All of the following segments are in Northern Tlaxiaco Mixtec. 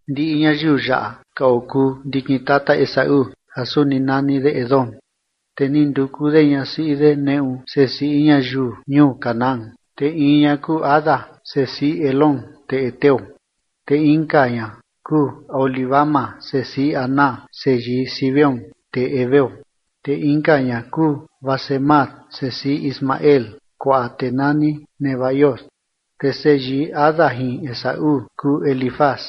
Ndiꞌi ñayiu yaꞌa ka okuu ndikin tata Esaú ja suni nani de Edom. Te ni nduku de ñasiꞌi de neꞌu sesiꞌi ñayiu ñuu Canaán, te in ña kuu Ada, sesiꞌi Elón tee heteo, te inka ña kuu Aholibama, sesiꞌi Aná, seyii Zibeón, tee heveo. Te inka ña kuu Basemat sesiꞌi Ismael, kuaꞌa tee nani Nebaiot. Te seyii Ada jin Esaú kuu Elifaz,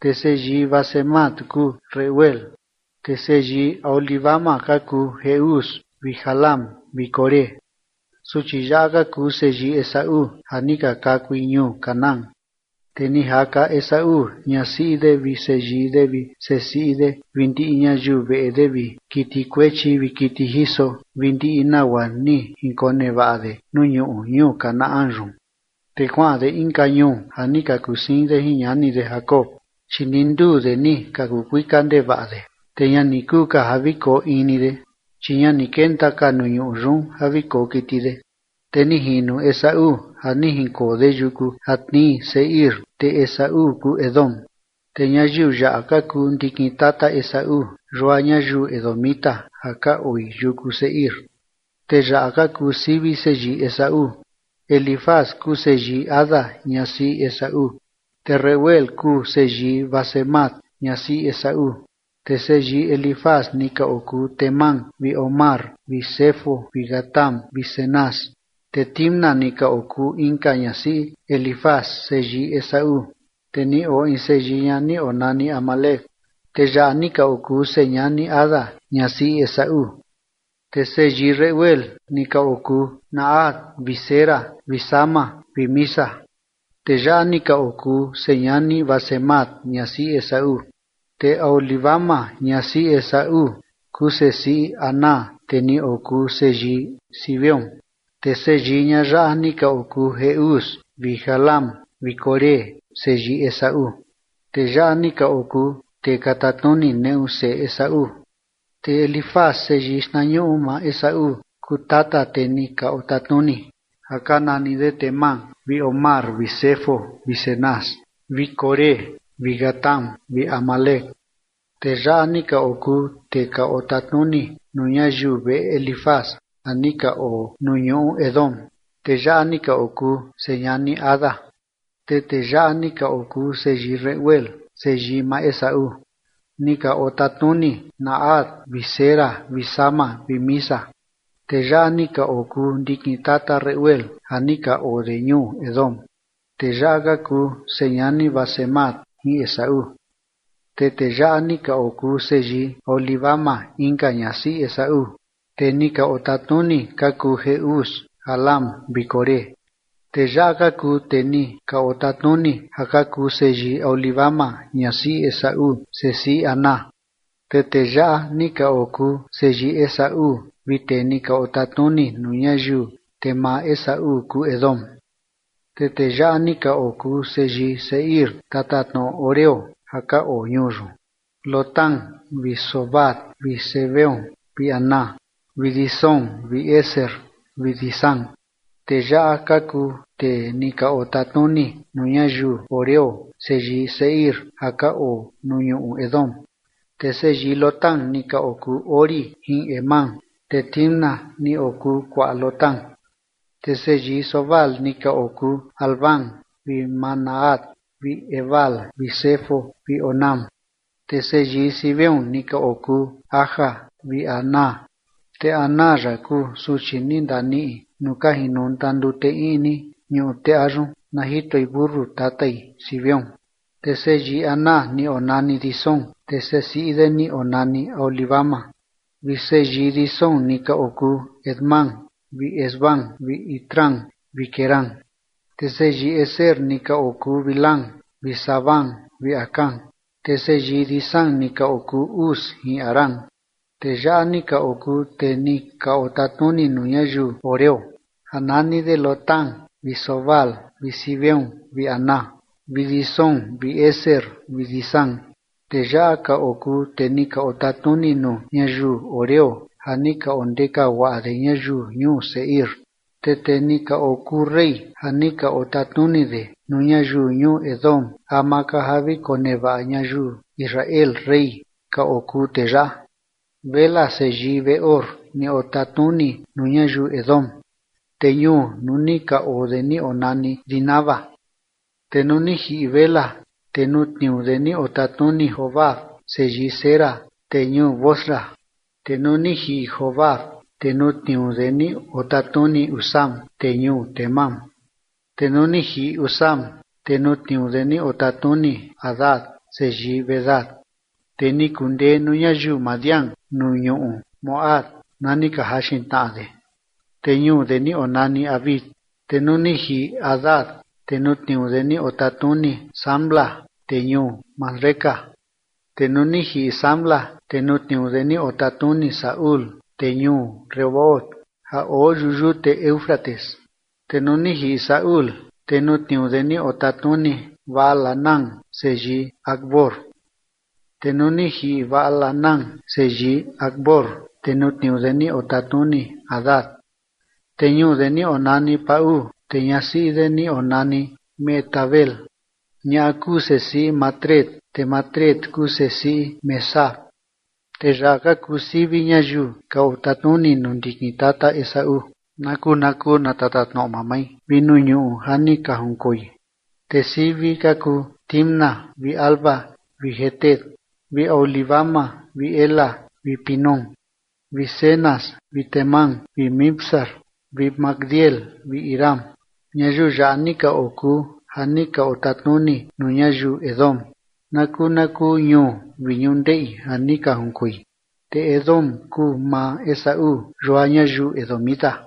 te seyii Basemat kuu Reuel. Te seyii Aholibama ka kuu Jeús vi Jaalam vi Coré. Suchi yaꞌa ka kuu seyii Esaú ja ni ka kakui ñuu Canaán. Te ni jaka Esaú ñasiꞌi de vi seyii de vi sesiꞌi de vi ndiꞌi ñayiu veꞌe de vi kiti kuechi vi kiti jiso vi ndiꞌi nagua ni jinkonevaꞌa de nuu ñuꞌu ñuu Canaán yun, te kuaꞌan de inka ñuu ja ni ka kusiin de jin ñani de Jacob. Chi ndi nduu de ni ka kuu kuika ndevaꞌa de, te ña ni kuu ka ja vi koo in ni de, chi ña ni kenta ka nuu ñuꞌu yun ja vi koo kiti de. Te ni jino Esaú ja ni jinkoo de yuku ja tnii Seir, te Esaú kuu Edom. Te ñayiu yaꞌa ka kuu ndikin tata Esaú, yua ñayiu edomita ja ka oi yuku Seir. Te yaꞌa ka kuu sivi seyii Esaú: Elifaz kuu seyii Ada ñasiꞌi Esaú, te Reuel kuu seyii Basemat ñasiꞌi Esaú. Te seyii Elifaz ni ka okuu Temán vi Omar vi Zefo vi Gatam vi Cenaz. Te Timna ni okuu inka ñasiꞌi Elifaz seyii Esaú, te ni oo in seyii ña ni onani Amalec. Tee yaꞌa ni ka okuu señani Ada ñasiꞌi Esaú. Te seyii Reuel ni ka okuu Nahat vi Zera vi Sama vi Miza. Tee yaꞌa ni ka okuu señani Basemat ñasiꞌi Esaú. Te Aholibama ñasiꞌi Esaú, kuu sesiꞌi Aná tee ni okuu seyii Zibeón. Te seyii ñaꞌa yaꞌa ni ka okuu Jeús vi Jaalam vi Coré, seyii Esaú. Tee yaꞌa ni ka okuu tee ka tatnuni neꞌu seꞌe Esaú. Te Elifaz seyii xtnañuꞌu maa Esaú kuu tata tee ni ka otatnuni ja ka nani de Temán vi Omar vi Zefo vi Cenaz vi Coré vi Gatam vi Amalec. Tee yaꞌa ni ka okuu tee ka otatnuni nuu ñayiu veꞌe Elifaz ja ni ka oo nuu ñuꞌu Edom. Tee yaꞌa ni ka okuu señani Ada. Te tee yaꞌa ni ka okuu seyii Reuel seyii maa Esaú. Ni ka otatnuni Nahat vi Zera vi Sama vi Miza. Tee yaꞌa ni ka okuu ndikin tata Reuel ja ni ka oo de ñuu Edom. Tee yaꞌa ka kuu señani Basemat jin Esaú. Te tee yaꞌa ni ka okuu seyii Aholibama inka ñasiꞌi Esaú, tee ni ka otatnuni ka kuu Jeús, Jaalam vi Coré. Tee yaꞌa ka kuu tee ni ka otatnuni ja ka kuu seyii Aholibama ñasiꞌi Esaú, sesiꞌi Aná. Te tee yaꞌa ni ka okuu seyii Esaú vi tee ni ka otatnuni nuu ñayiu, te maa Esaú kuu Edom. Te tee yaꞌa ni ka okuu seyii Seir, tatatnoꞌo horeo, ja ka oo ñuu yun: Lotán vi Sobal vi Zibeón vi Aná vi Disón vi Ezer vi Disán. Tee yaꞌa ka kuu tee ni ka otatnuni nuu ñayiu horeo, seyii Seir ja ka oo nuu ñuꞌu Edom. Te seyii Lotán ni ka okuu Hori jin Hemam, te Timna ni okuu kuaꞌa Lotán. Te seyii Sobal ni ka okuu Alván vi Manahat vi Ebal vi Sefo vi Onam. Te seyii Zibeón ni ka okuu Aja vi Aná, te Aná yaꞌa kuu suchi ni ndaniꞌi nuu ka jinonta ndute iꞌni ñuꞌu teꞌa yun na jitoi mentu tatai Zibeón. Te seyii Aná ni onani Disón, te sesiꞌi de ni onani Aholibama. Te seyii Disón ni ka okuu Hemdán vi Esbán vi Itrán vi Querán. Te seyii Ezer ni ka okuu Bilhán vi Zaaván vi Acán. Te seyii Disán ni ka okuu Uz jin Arán. Tee yaꞌa ni ka okuu tee ni ka otatnuni nuu ñayiu horeo, ja nani de Lotán vi Sobal vi Zibeón vi Aná vi Disón vi Ezer vi Disán. Tee yaꞌa ka okuu tee ni ka otatnuni nuu ñayiu horeo ja ni ka ondeka guaꞌa de ñayiu ñuu Seir. Te tee ni ka okuu rey ja ni ka otatnuni de nuu ñayiu ñuu Edom ama ka ja vi konevaꞌa ñayiu Israel rey ka okuu tee yaꞌa. Bela seyii Beor ni otatnuni nuu ñayiu Edom, te ñuu nuu ni ka oo de ni onani Dinaba. Te nuu ni jiꞌi Bela, te nuu tniuu de ni otatnuni Jobab seyii Zera tee ñuu Bosra. Te nuu ni jiꞌi Jobab, te nuu tniuu de ni otatnuni Husam tee ñuu Temán. Te nuu ni jiꞌi Husam, te nuu tniuu de ni otatnuni Hadad seyii Bedad, tee ni kundee nuu ñayiu Madián nuu ñuꞌu Moab na ni ka jaxin tnaꞌa de, te ñuu de ni onani Avit. Te nuu ni jiꞌi Hadad, te nuu tniuu de ni otatnuni Samla tee ñuu Masreca. Te nuu ni jiꞌi Samla, te nuu tniuu de ni otatnuni Saúl tee ñuu Rehobot ja oo yuꞌu yute Éufrates. Te nuu ni jiꞌi Saúl, te nuu tniuu de ni otatnuni Baal-hanán seyii Acbor. Te nuu ni jiꞌi Baal-hanán seyii Acbor, te nuu tniuu de ni otatnuni Hadad, te ñuu de ni onani Pau, te ñasiꞌi de ni onani Mehetabel, ñaꞌa kuu sesiꞌi Matred, te Matred kuu sesiꞌi Mezaab. Te yaꞌa ka kuu sivi ñayiu ka otatnuni nuu ndikin tata Esaú na kuu na kuu na tatatnoꞌo mamai vi nuu ñuꞌu ja ni ka jinkoi. Te sivi ka kuu Timna vi Alva vi Jetet vi Aholibama vi Ela vi Pinón vi Cenaz vi Temán vi Mibzar vi Magdiel vi Iram. Ñayiu yaꞌa ni ka okuu ja ni ka otatnuni nuu ñayiu Edom na kuu na kuu ñuu vi ñundeꞌi ja ni ka junkoi. Te Edom kuu maa Esaú, yua ñayiu edomita.